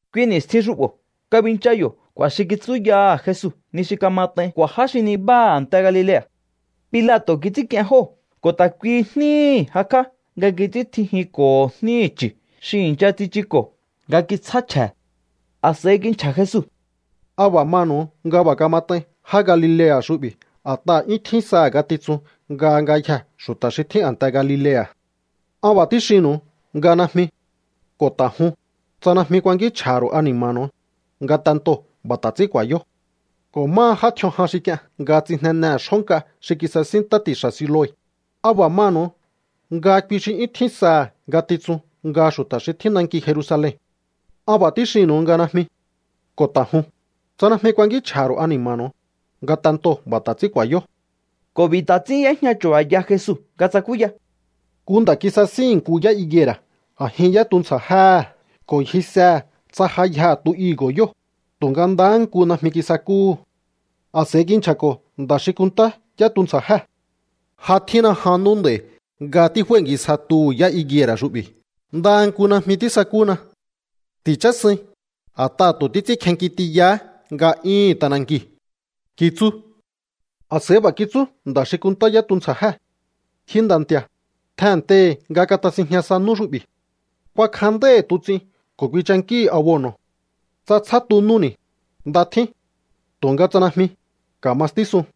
Kui ni̱stjin xu'bo̱ kabincha yo̱ k'u̱a̱ xi kitsúyaha̱ Jesu ni xi kamat'ain k'u̱a̱ já xi nibáha a̱nte Galilea̱. Pilato̱ kits'ínk'ien jóo̱ ko̱ ta̱ kuihi jníhi̱ jakj'á nga kits'íntjijinko̱ho jníhi̱ chu̱ xi i̱ncha tsichuko̱ nga kitsjá chje̱. A̱s'a̱i kinchja̱ Jesu: —¿A b'a̱ manu̱u nga b'a̱ kamat'ain já Galilea̱ xu'bi̱ a̱t'aha̱ 'yún tjín saha̱ ngatitsun nga ngayjee̱ xu̱ta̱ xi tjín a̱nte Galilea̱? An b'a̱ tíxinnu̱u nga najmi. Ko̱ ta̱ jun, tsa najmi kuankínchj'a̱ha̱ ru̱u ani̱ma̱nu̱u, ngatentoo̱ b'a̱ ta̱ ts'ín ku̱a̱yó. Ko̱ máha já tj'ion jan xi k'ien nga tsijnenehe̱ xjó nk'a xi kisasín ntá ti̱xa̱ Siloe, ¿a b'a̱ manu̱u nga kui xi 'yún tjín saha̱ ngatitsun nga xu̱ta̱ xi tjín nanki Jerusalen? An b'a̱ tíxinnu̱u nga najmi. Ko̱ ta̱ jun, tsa najmi kuankínchj'a̱ha̱ ru̱u ani̱ma̱nu̱u, ngatentoo̱ b'a̱ ta̱ ts'ín ku̱a̱yó. Ko̱ b'i̱ ta̱ ts'ín y'éjña chu̱ba̱ya Jesu nga tsakúya: —Nku nda̱ kisasíhi̱n nku yá higuera̱ a̱jin yá tuntsja̱jéhe̱ ko̱ ngjisehe̱ tsa ja yjaha̱ tu higo̱ yóo̱, tu̱nga ndahá nku najmi kisakúhu̱. A̱s'a̱i kinchja̱ko̱ nda̱ xi kunntá yá tuntsja̱jée̱: “Ja tjínna jan nú nd'a̱i̱ nga tíf'ái̱ngisja tuhu̱ yá higuera̱ xu'bi̱. Ndaha nku najmi tísakúna. Ti̱chásuin, a̱t'aha̱ tu̱ títs'ínkjenki tiyahá nga'yúhu̱n t'anankiu̱”, kitsú. A̱s'a̱i b'a̱ kitsú nda̱ xi kunntá yá tuntsja̱jée̱: “Ji nda̱ nti̱a̱, tjennteihi̱ nga katasinjña sa nú xu'bi̱. Kuakjanndáíhi̱ tuts'in ko̱ kuinchankíhi̱ abono̱. Tsa tsjá tu núni̱, nda tjín. Tu̱nga tsa najmi, ka̱ma stísun.”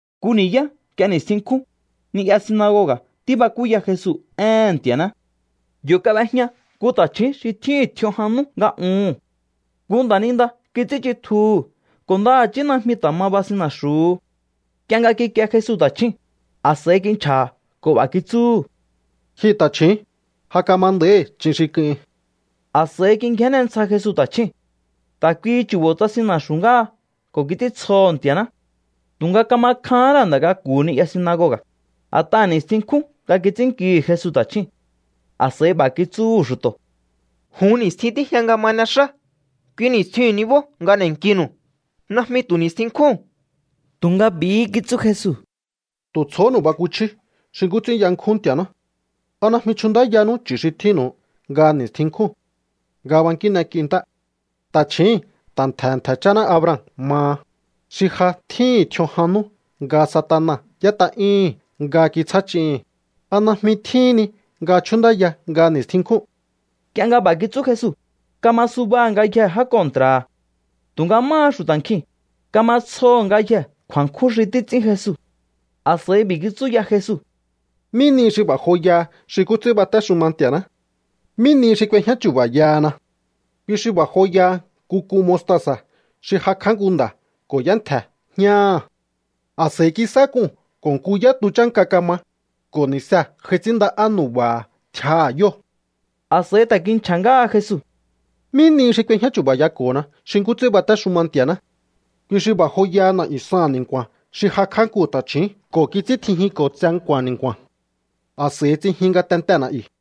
Nku ni̱yá nk'ie ni̱stjin nkjún, ni'ya sinagoga̱ tíbakúya Jesu éhe̱n Nti̱a̱ná. Yo̱ kab'ejña nku ta̱chju̱ún xi tjíhi̱n tj'ion jan nú nga uhu̱n. Nku nda̱ninda kits'ínchitjuhu̱ ko̱ ndaha̱chí najmi ta̱ ma basin na̱xu̱hu. Nk'ie nga kikie Jesu ta̱chjúu̱n, a̱s'a̱i kinchja̱ha̱ ko̱ b'a̱ kitsúhu̱: —Ji ta̱chju̱ún, ja kama nda̱íhi ch'in xi k'uhin. A̱s'a̱i kingjénne ntsja Jesu ta̱chjúu̱n. Ta̱ kuihi chu̱bo̱ tsasin na̱xu̱ ngáha ko̱ kits'íntsjoho̱ Nti̱a̱ná. Tu̱nga kama kjahán ra̱ nda̱ k'aku̱hu̱ ni'ya sinagoga̱, a̱t'aha̱ ni̱stjin nkjún nga kits'ínnkihi̱ Jesu ta̱chjúu̱n. A̱s'a̱i b'a̱ kitsúhu̱ xu̱to̱: —Jun ni̱stjin tíjña nga ma n'exá. Kui ni̱stjiu̱n nibó nga n'e̱nkinu̱u, najmi tu̱ ni̱stjin nkjúu̱n. Tu̱nga b'i̱hí kitsú Jesu: —¡Tu̱ tsjohónu̱u bakuchjíú xi nkú ts'ín yankjún Nti̱a̱ná! ¿A najmi chjunndáyanú chu̱ xi tjínnu̱u nga ni̱stjin nkjún nga bankín n'ek'iu ntá? Ta̱chjíi̱n ta̱ ntje̱he̱ ntje̱ cháná Abraham maha, xi ja tjíhi̱n tj'ion jan nú nga Satana y'ét'a'yúhu̱n nga kitsjá ch'ihi̱n, ¿a najmi tjíhín ni nga chjúnndáya nga ni̱stjin nkjún? Nk'ie nga b'a̱ kitsú Jesu, kama subaha̱ ngayjee̱ já kontra̱ha̱. Tu̱nga máha xu̱ta̱ nkjiu̱n, kama tsjoho̱ ngayjee̱ kju̱a̱nkjún xi títs'ín Jesu. A̱s'a̱i b'i̱ kitsú ya Jesu: —¿Mí nihi xi b'a̱ joyaha xi nkú ts'ín batéxuma Nti̱a̱ná? ¿Mí nihi xi k'uejñá chu̱ba̱yahana? Kui xi b'a̱ joyaha nku k'un mostasa̱ xi jakj'á nku nda̱ ko̱ y'éntje̱ jñáha̱. A̱s'a̱i kisá k'uu̱n ko̱ nku yá tu chánka kama, ko̱ ni̱see̱ j'ai ts'ínnda'á nu̱ba̱ha̱ tjiaha̱ yóo̱. A̱s'a̱i ta̱ kinchja̱ ngáha Jesu: —¿Mí nihi xi k'uejñá chu̱ba̱yako̱hona xi nkú ts'ín batéxuma Nti̱a̱ná? Kui xi b'a̱ joyaha na̱'yu̱ saha̱n ni̱nku̱a̱n xi jakj'á nku ta̱chju̱ún ko̱ kits'íntjijinko̱ tse nku̱a̱n ni̱nku̱a̱n. A̱s'a̱i tsijin ngatentee̱ na̱'yu̱.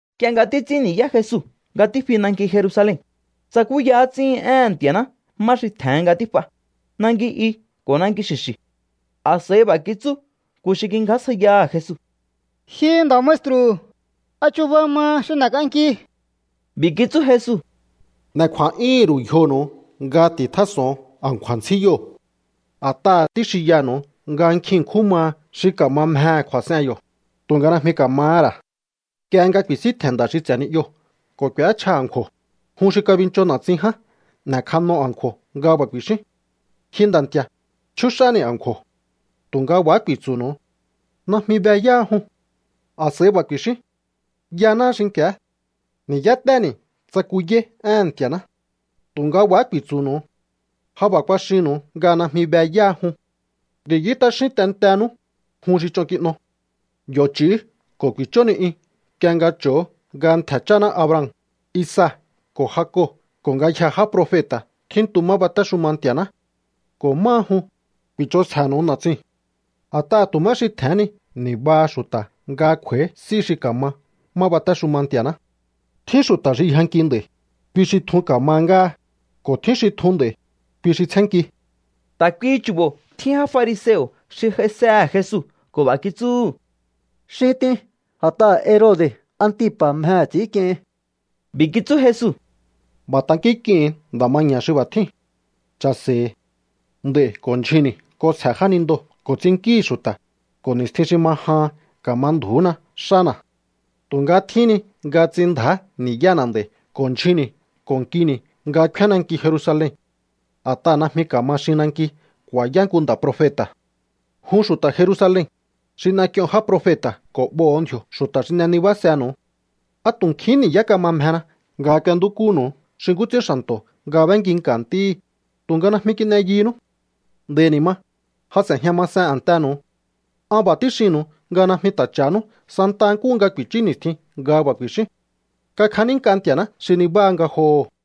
Nk'ie nga títs'ín ni̱yá Jesu nga tífi nanki Jerusalen, tsakúya ts'íhi̱n éhe̱n Nti̱a̱ná má xi tje̱hen nga tíf'a, nanki i ko̱ nanki xi̱xi̱. A̱s'a̱i b'a̱ kitsú nku xi kingjásjaiyaha̱ Jesu: —Ji Nda̱ maestru, ¿a chuba maha xi n'e̱k'anki? B'i̱ kitsú Jesu: —N'e̱ kju̱a̱'yúhu̱n ru̱u yjonu̱u nga ti̱tjás'o̱on a̱nkju̱a̱ ntsjíyoo̱. A̱t'aha̱ tíxinyanu̱u nga nkjin ṉkjún maha xi ka̱ma mjehe̱ kju̱a̱s'en yo̱, tu̱nga najmi ka̱mahá ra̱. Nk'ie nga ku̱i̱síntje̱n nda̱ xi ts'e̱ ni'yoo̱ ko̱ k'u̱échja a̱nkju̱o̱, jun xi kabincho na̱tsin ján n'e̱kjano a̱nkju̱o̱ nga b'a̱ ku̱i̱xíún: “Ji nda̱ nti̱a̱, chjúx'áni̱ a̱nkju̱o̱.” Tu̱nga b'a̱há ku̱i̱tsu̱nu̱u: “Najmi be yáha jun.” A̱s'a̱i b'a̱ ku̱i̱xíún: “Yanáá xinki̱á. Ni̱yáténi̱ tsakuyáí éhe̱n Nti̱a̱ná.” Tu̱nga b'a̱há ku̱i̱tsu̱nu̱u: “Ja b'a̱ kuaxinnu̱u nga najmi be yáha jun. Ti̱yú t'axín tentenú, jun xi ch'on kin'o.” ’Yo̱ ch'i̱ú ko̱ ku̱i̱chó ni'yun nk'ie nga cho̱o nga ntje̱ cháná Abraham, Isaac ko̱ Jacob ko̱ ngayjee̱ já profeta̱ tjíntu má batéxuma Nti̱a̱ná. Ko̱ máha jun, ku̱i̱ch'onsje̱nu̱u na̱tsiu̱n. A̱t'aha̱ tu̱ má xi tje̱hén ni ni̱baha xu̱ta̱ nga kj'u̱a̱í s'í xi ka̱ma má batéxuma Nti̱a̱ná. Tjín xu̱ta̱ xi yjanki nd'a̱i̱, kui xi tjun ka̱ma ngáha, ko̱ tjín xi tjun nd'a̱i̱, kui xi tsjénnki. Ta̱ kuihi chu̱bo̱ tjín já fariseo̱ xi j'aisehe̱ Jesu ko̱ b'a̱ kitsúhu̱: —Xin t'in, a̱t'aha̱ Herode̱ Antipa̱ mjehe̱ ts'i̱ínk'iehin. B'i̱ kitsú Jesu: —B'a̱ tankínk'ihu̱un nda̱ maña̱ xi b'a̱ tjíu̱n: “Cha̱se̱i̱. Nd'a̱i̱ ko̱ ndyjunni̱ k'onsje̱ jánindoo̱ ko̱ ts'innkíhi̱ xu̱ta̱, ko̱ ni̱stjin xi ma jahan ka̱ma ndju̱úna xána̱.” Tu̱nga tjíhín ni nga ts'inndja̱á ni̱yána̱ nd'a̱i̱ ko̱ ndyjunni̱ ko̱ nkini̱ nga kfíán nanki Jerusalen. A̱t'aha̱ najmi ka̱ma xin nanki ku̱a̱yá nku nda̱ profeta̱. ’¡Jun xu̱ta̱ Jerusalen, xi n'ek'ion já profeta̱ ko̱ b'oho̱o ndji̱o̱ xu̱ta̱ xi n'e nibásenu̱u! ¡A tu̱ nkjihín ni̱yá kama mjena nga k'uentúkúnu̱u xi nkú ts'ín xa̱nto̱ nga b'énkinka̱ ntíhí, tu̱nga najmi kin'e yunú! Nd'a̱i̱ ni̱ ma, ja s'e̱jña masen a̱ntenu̱u. An b'a̱ tíxinnu̱u nga najmi ta̱ cha̱hanú santa nkúhu nga ku̱i̱chú ni̱stjin nga b'a̱ ku̱i̱xíún: “¡Kakjanínk'a Nti̱a̱ná xi nibáha ngajoho̱!”